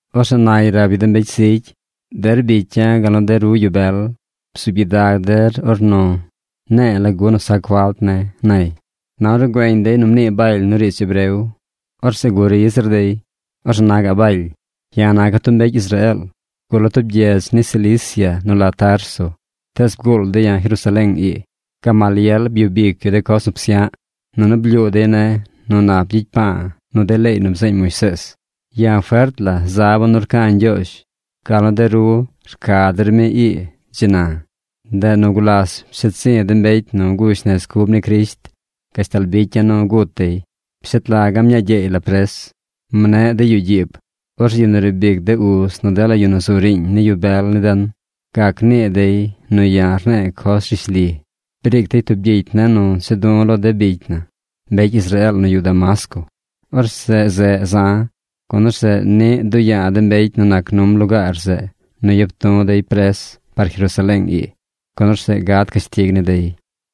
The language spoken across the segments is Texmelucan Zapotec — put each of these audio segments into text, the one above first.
Orzeꞌ nay rab yu de mbecy zigy: ―Der bicya̱ gal nu de ru yu bel, bzuub gyidag der ornu ne̱e̱ lagu nu sac falt ne̱ ―nay. Na ornu güeñ dey nu mnii Baly nu riidz hebreo, orzeꞌ guri zir dey. Orzeꞌ na gaꞌ Baly: ―Ya̱ naca̱ tub mbecy Israeel. Gula̱ tub gyedz ni Cilicia nu la Tarso, tees bguul dey ya̱ Jerusaleeng ii. Gamaliel byub ic yu de coz nu psya̱ꞌ, nunu blyuu dey ne̱ nu nap gyicy pa̱a̱ nu de leey nu bzeeñ Moisees. Ya̱ fert la zaba̱ nu rca̱ Ñgyoozh gal nu de ru rca der mi ii dzi na. Ndeꞌ nu gulas psheed zi̱ de mbecy nu gush nez cub ni Crisht gashtal bicya̱ nu gut dey. Pshet laga̱ mñaa gyeey la pres. Mne̱ꞌ dey yuꞌ gyiib. Orzeꞌ yu nu riib ic de uz nu dela yu nu zu riiñ ni yu bel ni den gac nii dey nu ya̱ rne̱e̱ coz rishli. Briic dey tub gyicy ne̱ nu cha̱ du̱ lo de bicy na, mbecy Israeel nu yuꞌ Damasco. Orzeꞌ zeꞌ za̱, gun orzeꞌ niꞌ duꞌ ya̱a̱ de mbecy nu nac num lugaar zeꞌ nu yap du̱ dey pres par Jerusaleeng ii, gun orzeꞌ gad cashtig ni dey.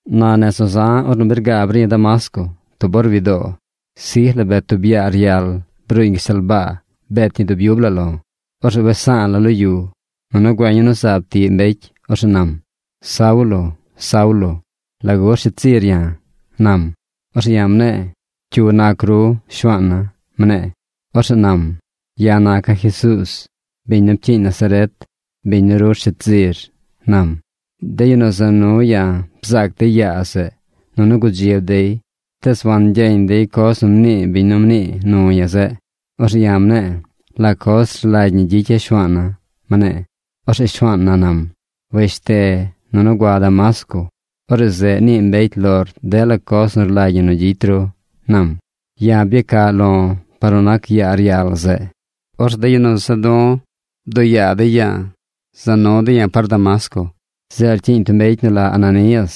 ’Na nez nu za̱ ornu bi rgaab ri̱ Damasco tub or wi doo, sij la bet tub yaa ryal bruuñ gashtal baa bet ñi dub yub la lo̱. Orzeꞌ wes sa̱a̱ la̱ lo yu, nunu güeñ ya̱ nu zaab tiꞌ mbecy. Orzeꞌ nam: “Saulo, Saulo, ¿lagu rsheed zir ya̱?” nam. Orzeꞌ ya̱ mne̱e̱: “¿Cyu nac ru, Shuaana̱?” mne̱e̱. Orzeꞌ nam: “Ya̱ naca̱ Jesuuz, biñ nu pcyiiñ Nazaret, biñ nu ru rsheed zir”, nam. De yu nu za nu ya̱ bzaac dey yaa zeꞌ, nunu gudzib dey tees wangyeñ dey coz nu mnii biñ nu mnii nu ya̱ zeꞌ. Orzeꞌ ya̱ mne̱e̱: “¿La coz rlagy ñi gyicya̱ Shuaana̱?” mne̱e̱. Orzeꞌ Shuaan na nam: “Weshte nunu gua Damasco. Orzeꞌ zeꞌ nii mbecy lor dela coz nu rlagy ñi nu gyicy ru”, nam. Ya̱ byacaꞌ lo̱ par nu nac yaa ryal zeꞌ. Orzeꞌ de yu nu za du̱ bduꞌ yaa dey ya̱a̱ za nu dey ya̱ par Damasco. ’Zeꞌ rcyiiñ tub mbecy nu la Ananías.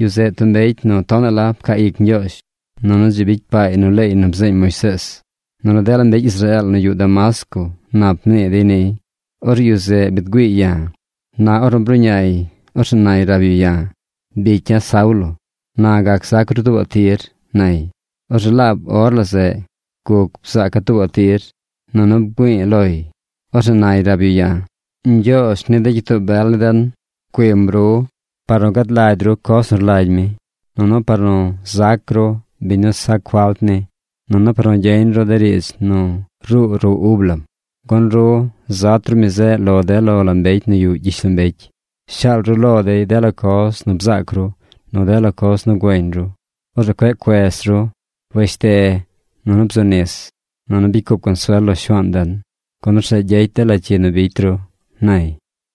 Yu zeꞌ tub mbecy nu tonaꞌ la pcaa ic Ñgyoozh, nunu dzi bicy paay nu leey nu bzeeñ Moisees, nunu dela mbecy Israeel nu yuꞌ Damasco nap mnii dey niy. Orzeꞌ yu zeꞌ biid güiiy ya̱. Na ornu bruꞌñay, orzeꞌ nay rab yu ya̱: “Bicya̱ Saulo, na gac zac ru tuubaꞌ tir”, nay. Orzeꞌ laab or la zeꞌ guc bzaaca̱ tuubaꞌ tir, nunu bgüi̱i̱ loy. Orzeꞌ nay rab yu ya̱: “Ñgyoozh ni de gyitoo bel ni den pcuiim ru par nu gad lagy ru coz nu rlagy mi, nunu par nu zac ru biñ nu sac falt ni, nunu par nu gyeñ ru de riidz nu ruu ruꞌ ub lam. Gun ru zat ru mi zeꞌ lo de lo la mbecy nu yuꞌ gyishlombecy. Shaal ru lo dey dela coz nu bzaac ru, nu dela coz nu güeñ ru. Orzeꞌ cueꞌ cuez ru. Weshte, nunu bzu nis, nunu bicy cup consuel lo Shuaan den, gun orzeꞌ gyecy dela cyi nu bicy ru”, nay.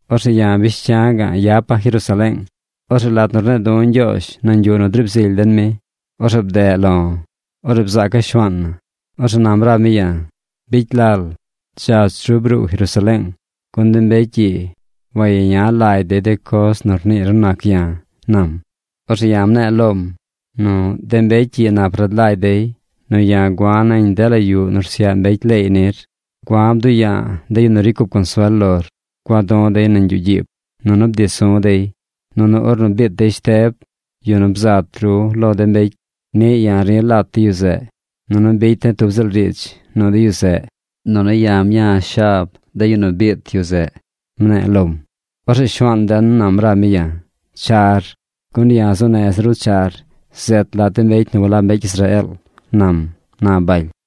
’Orzeꞌ ya̱ bish cya̱ ga̱ꞌ yapa̱ Jerusaleeng. Orzeꞌ lat nu rne̱e̱ du̱ Ñgyoozh nañ yuꞌ nu driib zily den mi, orzeꞌ bdeꞌ lo̱. Orzeꞌ bzaaca̱ Shuaan na. Orzeꞌ nam rab mi ya̱: “Bicy lal. Dzach ru bruu Jerusaleeng, gun de mbecy ii wayeña lagy dey de coz nu rniir nu nac ya̱”, nam. Orzeꞌ ya̱ mne̱e̱ lom nu “De mbecy ii nap rad lagy dey nu ya̱ gua̱ nañ dela yuꞌ nu rsyaꞌ mbecy leey nir. Gua̱ bduꞌ ya̱a̱ de yu nu ricy cup consuel lor. Gua du̱ dey nañ yuꞌ gyiib. Nunu bdi su̱ dey. Nunu ornu biit dey Shteb, yu nu bzat ru lo de mbecy, niꞌ ya̱ ri̱ lat de yu zeꞌ, nunu bicy de̱ tub ziꞌl riidz nu de yu zeꞌ. Nunu ya̱ mña̱ shab de yu nu biit dey zeꞌ”, mne̱e̱ lom. Orzeꞌ Shuaan den nam rab mi ya̱: “Char, gun ya̱ zuu neza̱ ru char zet lat de mbecy nu walab mbecy Israeel”, nam ―na Baly.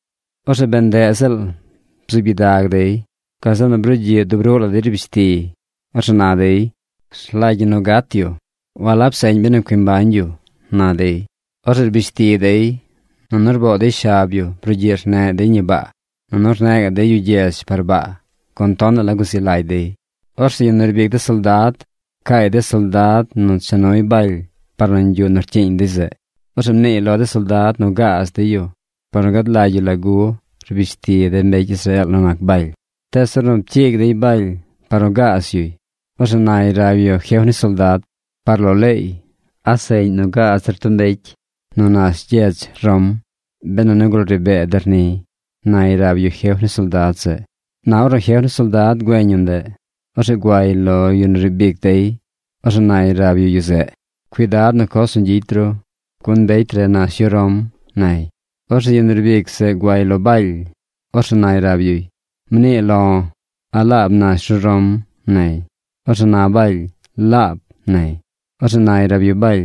Orzeꞌ bee ndeꞌ ziꞌl bzuub gyidag dey. Gazeꞌ nu brugyiꞌ dub ruꞌ la dey rbish tiy. Orzeꞌ na dey: ―¡Rlagy ñi nu gat yu! ¡Walab seꞌñ benu cui mbañ yu! ―na dey. Orzeꞌ rbish ti dey, nunu rboo dey shab yu brugyiꞌ rneꞌ dey ñi baa. Nunu rneꞌ gaꞌ dey yu gyedz par baa, gun tonaꞌ la guzi lagy dey. Orzeꞌ yu nu riib ic de soldad pcaay de soldad nu cha nuy Baly par nañ yuꞌ nu rcyiiñ dey zeꞌ. Orzeꞌ mniiy lo de soldad nu gaaz dey yu par nu gad lagy yu lagu rbish ti de mbecy Israeel nu nac Baly. Tees ornu pcyiig dey Baly par nu gaaz yuy, orzeꞌ nay rab yu jef ni soldad: ―Par lo leey, ¿a seꞌñ nu gaaz der tub mbecy nu nash gyedz Rom benu nigul ri bee dey niy? ―nay rab yu jef ni soldad zeꞌ. Na ornu jef ni soldad güeñ yu ndeꞌ, orzeꞌ guay lo yu riib ic dey. Orzeꞌ nay rab yu yu zeꞌ: ―Cuidad nu coz nu gyicy ru, gun mbecy re nash yu Rom ―nay. Orzeꞌ yu riib ic zeꞌ guay lo Baly. Orzeꞌ nay rab yuy: ―Mnii lo̱. ¿A laab nash ru Rom? ―nay. Orzeꞌ na Baly: ―Laab ―nay. Orzeꞌ nay rab yu Baly: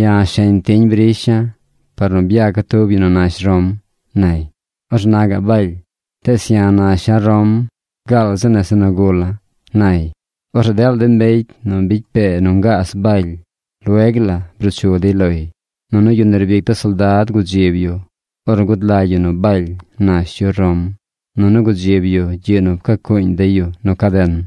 ―Ya̱ sheñ tiñ brisha̱ par nu byaca̱ tub yu nu nash Rom ―nay. Orzeꞌ na gaꞌ Baly: ―Tees ya̱ nasha̱ Rom gaal zi nese nu gula̱ ―nay. Orzeꞌ dela de mbecy nu bicy pee nu ngaaz Baly lueg la bruu chu dey loy. Nunu yu nu riib ic de soldad gudzib yu ornu gud lagy yu nu Baly nash yu Rom, nunu gudzib yu gyiꞌ nu pcacuuñ dey yu nu caden.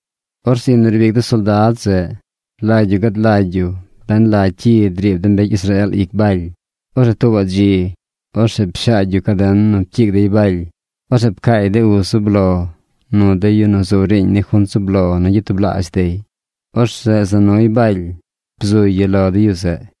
Orzeꞌ yu nu riib ic de soldad zeꞌ rlagy yu gad lagy yu ben la cyi driib de mbecy Israeel ic Baly. Orzeꞌ tuubaꞌ dzi, orzeꞌ pshaagy yu caden nu pcyiig dey Baly. Orzeꞌ pcaay de uz zub lo nu de yu nu zu riiñ ni junt zub lo nu gyatublaazh dey. Orzeꞌ za nuy Baly bzuy yu lo de yu zeꞌ.